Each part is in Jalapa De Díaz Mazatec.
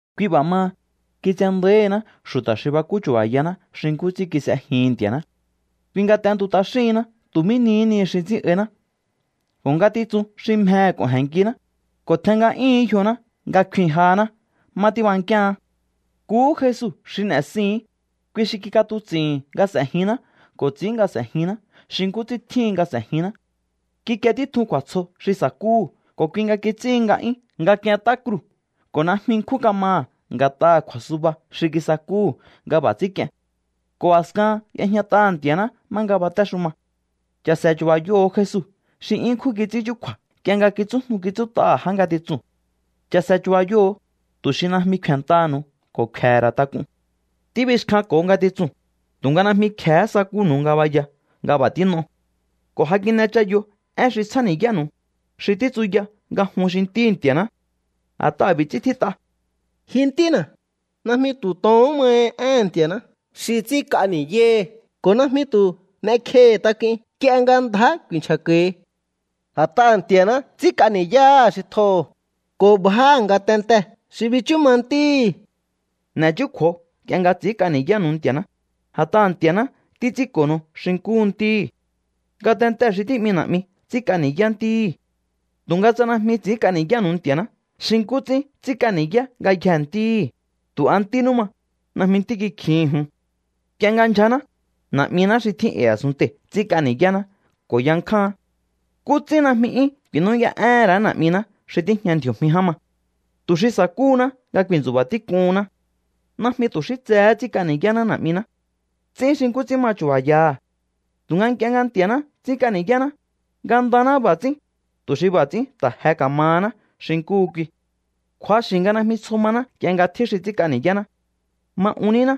Kui b'a̱ maha, kitsendáíhiná xu̱ta̱ xi bakú chu̱ba̱yaná xi nkú ts'ín kis'ejihi̱n Nti̱a̱ná. Kui nga t'entu t'axíhinná tu̱ mí nihí ni xi ts'ín'áíná ko̱ ngatitsun xi mjehe̱ k'o̱je̱nnkiná, ko̱ tjen nga'yúhu̱ún yjoná nga kfin jahaná má tíbankíaán. Nkuhú Jesu xi n'e̱sihi̱ín. Kui xi kik'atuts'i̱hi̱n nga s'ejinná ko̱ ts'ín nga s'ejinná xi nkú ts'ín tjíhin nga s'e̱jinná. Kikie títjun kju̱a̱tsjo xi sa̱kúhu̱ ko̱ kui nga kits'íhin nga'yún nga k'ient'á kruu̱ ko̱ najmi nkjún kamaha̱ nga̱t'aha̱ kju̱a̱suba xi kisakúhu̱ nga b'a̱ ts'ín k'ien. Ko̱ a̱skahan y'ejñat'aha̱ Nti̱a̱ná má nga batéxuma. Cha̱se̱ chu̱ba̱yoho̱o Jesu xi 'yún ṉkjún kits'ín chúkju̱a̱ nk'ie nga kitsújnu kitsút'aha̱ já ngatitsuu̱n. Cha̱se̱ chu̱ba̱yoho̱o, tu̱ xi najmi kfe̱ntaha̱nu̱u ko̱ kfe̱he̱ ra̱ tak'un. Tíbixkjanko̱o ngatitsuu̱n, tu̱nga najmi kje̱hé sakúnu̱u ngabaya nga b'a̱ tín'o. Ko̱ ja kin'echayo én xi tsjáni̱yánu̱u, xi títsuya nga jun xi ntíhi̱ Nti̱a̱ná. A̱t'aha̱ b'i̱ ts'ín tjít'a: Ji ntína̱, najmi tu̱ tohón mahi éhe̱n Nti̱a̱ná xi ts'ínk'a ni̱yáhi, ko̱ najmi tu̱ n'ekjehi̱ tak'uin nk'ie nga ndjá ku̱i̱nchja̱ko̱hi. A̱t'aha̱ Nti̱a̱ná ts'ínk'a ni̱yáha̱ xi tjoho̱, ko̱ bjáha̱ ngatentee̱ xi bichú ma ntíhi̱. N'e̱chúkju̱o nk'ie nga ts'i̱ínk'a ni̱yánu̱u Nti̱a̱ná, a̱t'aha̱ Nti̱a̱ná títs'ínko̱nu̱u xi nkúhu ntíhi̱. Ngatentee̱ xi tí'mi na̱'mi ts'ínk'a ni̱yá ntíhi̱. Tu̱nga tsa najmi ts'i̱ínk'a ni̱yánu̱u Nti̱a̱ná xi nkú ts'ín ts'ínk'a ni̱yá ngayjee̱ ntíhi̱, tu̱ a ntínú ma, najmi ntí kikjihi̱n jun. Nk'ie nga ndyjaná, na̱'miná xi tjín e̱i̱ a̱sunntei̱ ts'ínk'a ni̱yáná ko̱ yankjáán. ¿Nkú ts'ín najmi 'yún ku̱i̱nú'yá'éhe̱n ra̱á Na̱'miná xi tíjña ndji̱o̱jmi ján ma, tu̱ xi sa̱kúhuná nga ku̱i̱ntsu̱ba̱ tík'uhunná? Najmi tu̱ xí tsehé ts'ínk'a ni̱yáná na̱'miná. Ts'ín xi nkú ts'ín ma chu̱ba̱yaha̱. Tu̱nga nk'ie nga Nti̱a̱ná ts'ínk'a ni̱yáná, ngandaná b'a̱ ts'ín, tu̱ xi b'a̱ ts'ín ta̱ je ka̱mahaná xi nkuhu kui. Kju̱axi̱ nga najmi tsjo maná nk'ie nga tjín xi ts'ínk'a ni̱yáná. Ma un níná.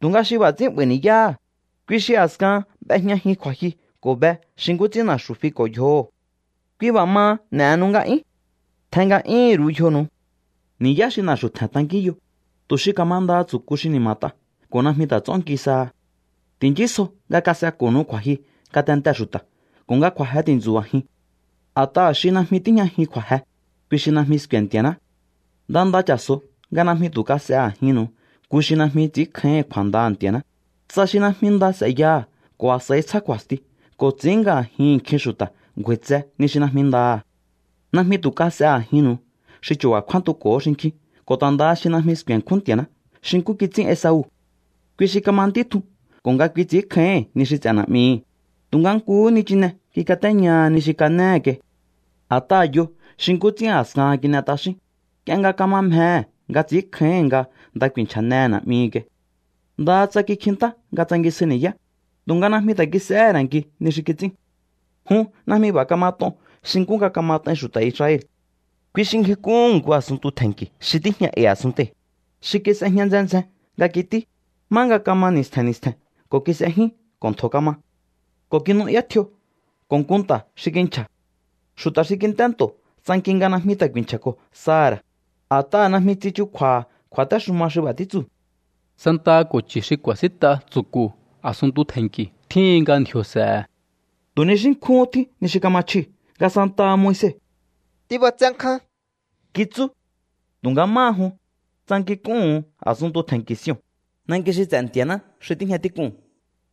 Tu̱nga xi b'a̱ ts'ín 'ba̱i̱ ni̱yáha̱, kui xi a̱skahan b'ejñajin kju̱a̱jyu ko̱ be xi nkú ts'ín na̱xu̱ fiko̱ yjoho̱. Kui b'a̱ maha, n'e̱henu nga'yún. Tjen nga'yúhu̱n ru̱u yjonu̱u. Ni̱yá xi na̱xu̱ tje̱n tankínyo, tu̱ xi ka̱mandaha tsu̱ku xi ni̱ma̱t'a ko̱ najmi ta̱ ts'ónki saha. Ti̱nchísjo nga kas'eko̱nu̱u kju̱a̱jyu ngatentee̱ xu̱ta̱ ko̱ nga kju̱a̱je ti̱ntsu̱ba̱jiun. A̱t'aha̱ xi najmi tíjñajin kju̱a̱je, kui xi najmi sku̱e̱ Nti̱a̱ná. Nda nda cha̱so̱o nga najmi tu̱ kas'e a̱jinnu̱u nku xi najmi ts'ínkjáíhi̱n kju̱a̱ndaha̱ Nti̱a̱ná, tsa xi najmi nda s'e̱yaha̱ ko̱ a̱s'a̱i tsjá kju̱a̱sti ko̱ ts'i̱ín nga a̱jihi̱n nkjin xu̱ta̱ ngju̱a̱i̱tse ni xi najmi ndaha̱. Najmi tu̱ kas'e a̱jinnu̱u xi chu̱ba̱ kjúántuko̱hó xinkjín ko̱ ta̱ ndaha xi najmi sku̱e̱nkjún Nti̱a̱ná xi nkú kits'ín Esau. Kui xi kama ntí tjun ko̱ nga kui ts'i̱ínkjáíhi̱n ni xi ts'e̱ na̱'mihi̱, tu̱nga nkuhú nichine kikatéñaha ni xi kanéhe̱ kai. A̱t'aha̱ yo xi nkú ts'ín a̱skahan kin'e t'axín, nk'ie nga kama mjehe̱ nga ts'i̱ínkjáíhi̱n nga nda ku̱i̱nchja̱nehe̱ na̱'mihi̱ kai. Ndaha tsa kikjintá nga tsangisjai ni̱yá, tu̱nga najmi ta̱ kis'ehé ra̱ nki ni xi kits'ín. Jun najmi b'a̱ kamat'on xi nkú nga kamat'ain xu̱ta̱ Israel. Kui xi ngjik'úhu̱n nku a̱sunntu tje̱nnki̱ xi tíjña e̱i̱ a̱sunntei̱, xi kis'ejña ndzjen ndzjen nga kití, má nga kama ni̱stje̱n ni̱stje̱n ko̱ kis'ejyún ko̱ ntjo̱ kama. Ko̱ kinu'yá tjio ko̱ nku nta̱ xi kinchja̱. Xu̱ta̱ xi kint'é nto̱ tsanki nga najmi ta̱ ku̱i̱nchja̱ko̱ saha̱ ra̱, a̱t'aha̱ najmi tsichukju̱a̱ha̱ kju̱a̱téxuma xi b'a̱ títsuu̱: “Santaha ko̱ chu̱ xi ku̱a̱sínt'a tsu̱ku̱ a̱sunntu tje̱nnki̱ tjíhin nga ndji̱o̱ s'e̱he̱.” Tu̱ ni xí nkjúhún tjín ni xi kama chjiu̱ nga santaha Moise: “Tíb'atsé nkján”, kitsú. Tu̱nga máha jun, tsankink'úhu̱un A̱sunntu Tje̱nnki̱ Sion, nanki xi ts'e̱ Nti̱a̱ná xi tíjña tík'uu̱n,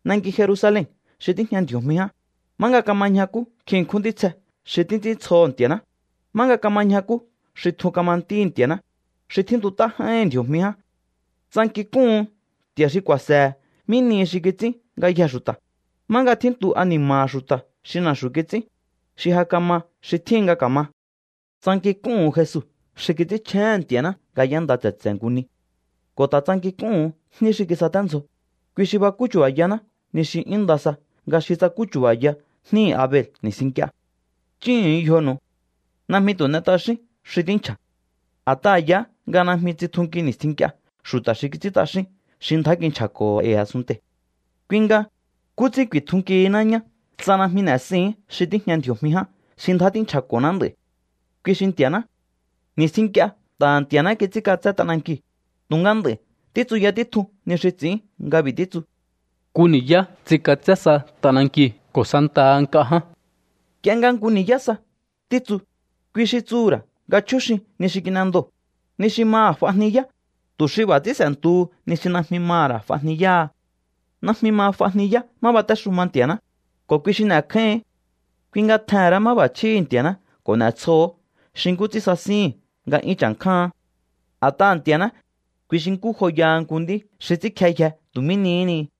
nanki Jerusalen xi tíjña ndji̱o̱jmi ján, má nga kama ñjakú nkjin ṉkjún ntítsje xi títs'íntsjoho̱ Nti̱a̱ná, má nga kama ñjakú xi tjun kama ntíhi̱ Nti̱a̱ná, xi tjíntut'á j'áíhi̱n ndji̱o̱jmi ján. Tsankink'úhu̱un Nti̱a̱ná xi ku̱a̱se̱he̱ mí nihi xi kits'ín ngayjee̱ xu̱ta̱, má nga tjíntu ani̱ma̱ha̱ xu̱ta̱ xi na̱xu̱ kits'ín, xi ja kama xi tjíhin nga ka̱ma. Tsankink'úhu̱un Jesu xi kits'ínchjéhe̱n Nti̱a̱ná nga y'énda tse̱tse̱ nku ni. Ko̱ ta̱ tsankink'úhu̱un jní xi kisaténdzjoo̱, kui xi bakú chu̱ba̱yaná ni xi 'yún nda sa nga xi tsakú chu̱ba̱ya jníhi̱ Abel ni̱stjin nk'ie. Chúhu̱un yjonu̱u. Najmi tu̱ n'e t'axíún xi tínchja̱. A̱t'aha̱ yaá nga najmi tsitjunki ni̱stjin nk'ie xu̱ta̱ xi kits'ín t'axín xi ndjá kinchja̱ko̱ho̱ e̱i̱ a̱sunntei̱. Kui nga, ¿nkú ts'ín ku̱i̱tjunkihiná ñá tsa najmi n'e̱sihi̱ín xi tíjña ndji̱o̱jmi ján xi ndjá tínchja̱ko̱ná nd'a̱i̱? Kui xi Nti̱a̱ná. Ni̱stjin nk'ie nta̱ha̱ Nti̱a̱ná kits'ínk'atsé t'anankiu̱, tu̱nga nd'a̱i̱ títsuya títjun ni xi ts'i̱ín nga b'i̱ títsu: “Nku ni̱yá ts'ink'atsé sa t'anankiu̱ ko̱ santaha nk'a ján.” Nk'ie nga “nku ni̱yá sa” títsu, kui xi tsuhu̱ ra̱ nga chjúxin ni xi kin'endoo̱, ni xi maha̱ f'ajniyá, tu̱ xi b'a̱ ts'ín s'e̱ntuhu ni xi najmi maha̱ ra̱ f'ajniyáha. Najmi ma f'ajniyá má batéxuma Nti̱a̱ná, ko̱ kui xi n'e̱kjáíhi̱ín. Kui nga tjehe̱n ra̱á máb'a̱chjíhi̱ Nti̱a̱ná ko̱ n'e̱tsjoo̱hó xi nkú ts'ín sasíhi̱n nga 'yún cha̱nkjáán. A̱t'aha̱ Nti̱a̱ná, kui xi nkú joyaha nku nd'í xi ts'ínkjeyje tu̱ mí nihí ni.